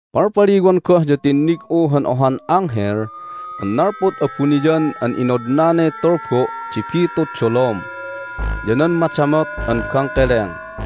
Palpaliwan goh ya tinnig'u han ohan anghel an nalpud abuniyan an inodnanay tulbo' di bitud dolom ya nan madamot an bangkeleng.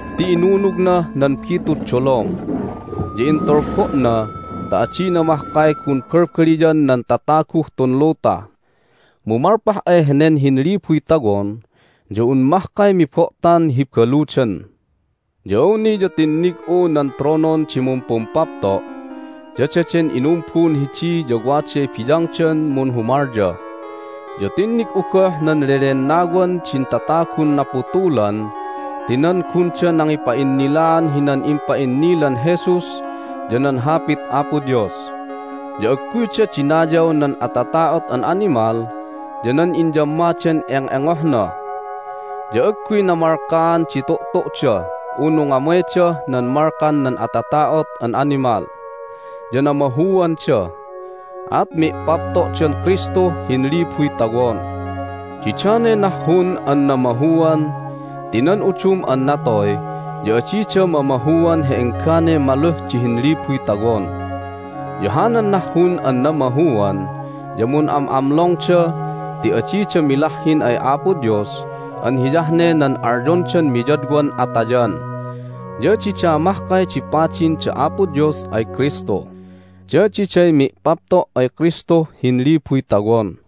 Ti inunugnah nan bitud dolom, ya intulbo'na ta adina mahkay gun balbaliyan nan tataguh tun luta. Mu malpah ay henen hinlibuy tawon ya un mahkay mibo'tan hi baludan. Ya awni ya tinnig'u nan tronon di mumpumpapto'. Ya daden inumbun hidi ya waday biyangdan munhumalya. Ya tinnig'u goh nan lelennawan din tatagun naputulan ti nan gunda nangipa'innilaan hinan impa'innilan Jesus ya nan Hapit Apo Dios. Ya agguyda dinayaw nan atata'ot an animal ya nan inyammadan eng'engohna, ya agguy namalkaan di tu'tu'da unu ngamaydah nan malkan nan atata'ot an animal. Ya namahuanda, at mi'papto'dan Kristuh Hinlibuy Tawon. Didanay nahhun an namahuan ti nan udum an natoy ya adida mamahuan hi engganay maluh di Hinlibuy Tawon. Ya hanan nahhun an namahuan ya mun'am'amlongda ti adida milahhin ay Apo Dios an hiyah ne nan alyondan miyadwan atayan. Ya dida mahkay di padin da Apo Dios ay Kristu, ya diday mi'papto' ay Kristuh Hinlibuy Tawon.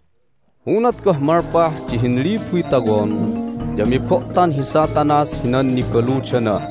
Unat goh malpah di Hinlibuy Tawon ya mibo'tan hi Satanas hinan nibaludana,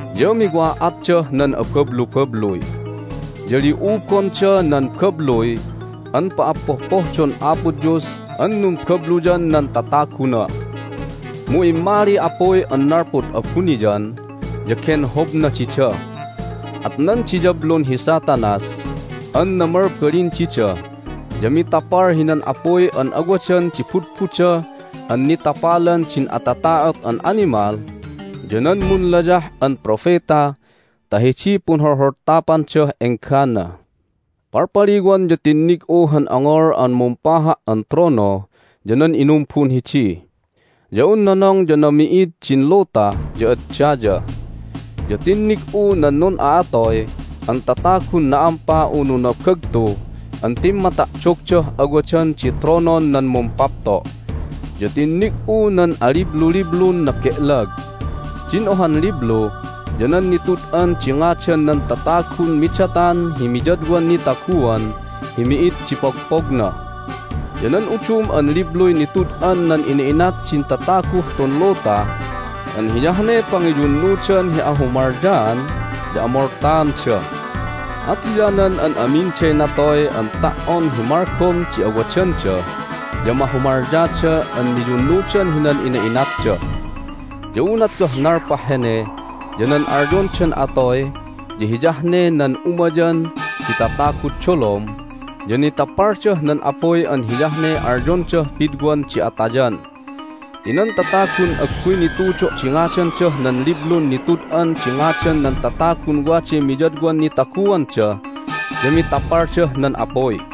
Ya miwa'atdah nan abablubabluy, ya li'ubonda nan babluy an pa'appohpohdon Apo Dios an numbabluyan nan tataguna, mu immaliy apuy an nalpud abuniyan, ya genhobna dida. At nan diyablun hi Satanas an namalbalin dida ya mitapal hinan apuy an awadan di budbuda an nitapalan din atata'ot an animal ya nan munlayah an propeta ta hidiy punholholtapandah enggana. Palpaliwan ya tinnig'u han ongol an mumpaha' an trono ya nan inumbun hidi. Ya un nonong ya nami'id din luta ya ad daya. Ya tinnig'u nan nun'a'atoy an tatagun na'ampa unu nabagtu an timmata'dogdah awadan di tronon nan Mumpapto'. Ya tinnig'u nan alibluliblun nabe'lag. Din ohan liblu ya nan Nitud'an di Ngadan nan Tatagun Midatan hi Miyadwan Nitaguan hi Mi'id di Pogpogna. Ya nan udum an libluy nitud'an nan ina'inat din tataguh tun luta an hiyah ne pangiyunnudan hi ahumalyaan ya amoltaanda. At hiyanan an aminday natoy an ta"on hi malgom di awadanda ya mahumalyada an miyunnudan hinan ina'inatda. Ya unat goh nalpah hene ya nan alyondan atoy ya hiyah ne nan umayan di tatagud dolom ya nitapaldah nan apuy an hiyah ne alyondah pidwan di atayan. Ti nan tatagun agguy nitudo' di ngadandah nan Liblun Nitud'an di Ngadan nan Tatagun Waday Miyadwan Nitaguanda ya mitapaldah nan apuy.